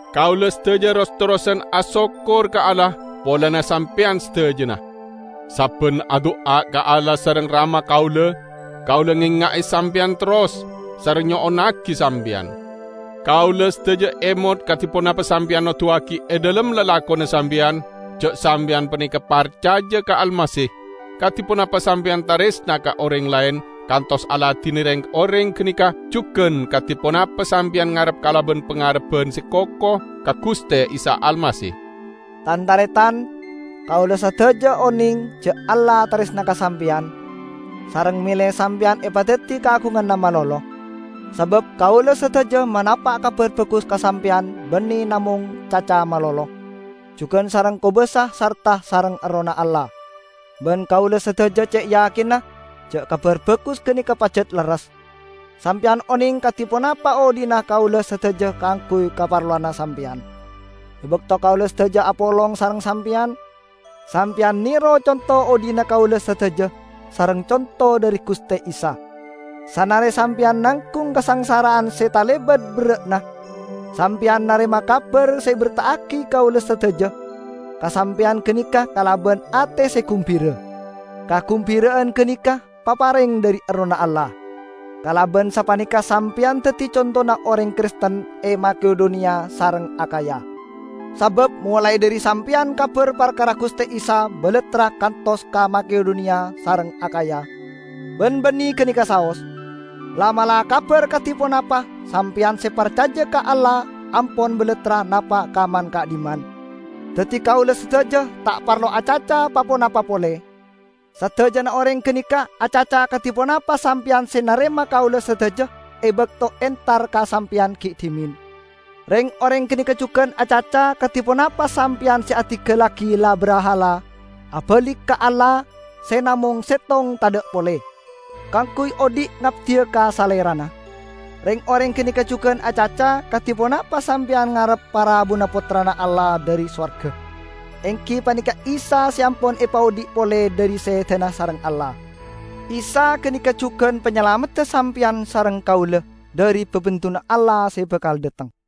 Kaula sadaja ros-terrosan asokkor ka Allah polana Sampeyan sadajana. Sabban adu'a ka Allah sareng Rama kaula, kaula ngenga'e sampeyan terros, sareng nyo'onnagi sampeyan. Kaula sadaja emot kadi ponapa sampeyan noduwagi e dhalem lalakonna sampeyan, ja' sampeyan paneka parcaja ka Almasih, kadi ponapa sampeyan taresna ka oreng laen kantos aladine reng-oreng ganeka, jugan kadi ponapa sampeyan ngarep kalaban pangarebban se koko ka Guste Isa Almasih. Tan-taretan, kaula sadaja oneng ja' Allah taresna ka sampeyan, sareng mele sampeyan epadaddi kaagunganna malolo. Sabab kaula sadaja manapa' Kabar Bagus ka sampeyan banne namong caca malolo, jugan sareng kobasa sarta sareng Errohna Allah. Ban kaula sadaja ce' yakinna ja' Kabar Bagus ganeka pajat lerres. Sampeyan oneng kadi ponapa odhi'na kaula sadaja kaangguy kaparlowanna sampeyan, e bakto kaula sadaja apolong sareng sampeyan. Sampeyan nero conto odhi'na kaula sadaja sareng conto dhari Guste Isa. Sanare sampeyan nanggung kasangsara'an se talebat berra'na, sampeyan narema kabar se eberta'agi kaula sadaja ka sampeyan ganeka kalaban ate se gumbira. Kagumbira'an ganeka papareng dhari Errohna Allah. Kalaban sapaneka sampeyan daddi contona oreng Kristen e Makedoniya sareng Akhaya. Sabab molae dhari sampeyan kabar parkara Guste Isa balattra kantos ka Makedoniya sareng Akhaya. Ban banne ganeka saos: la'-mala' kabar kadi ponapa sampeyan se parcaja ka Allah ampon balattra napa' ka man-ka'dhimman; daddi kaula sadaja ta' parlo acaca pa-ponapa pole. Sadajana oreng ganeka acaca kadi ponapa sampeyan se narema kaula sadaja e bakto entar ka sampeyan gi' dhimen. Reng-oreng ganeka jugan acaca kadi ponapa sampeyan se adinggallagi la-brahala abalik ka Allah se namong settong tadha' pole, kaangguy odhi' ngabdiya ka Salerana. Reng-oreng ganeka jugan acaca kadi ponapa sampeyan ngarep parabuna Pottrana Allah dhari sowarga, enggi paneka Isa se ampon epaodhi' pole dhari sedana sareng Allah. Isa ganeka jugan panyalamedda sampeyan sareng kaula dhari babendunna Allah se bakal dhateng.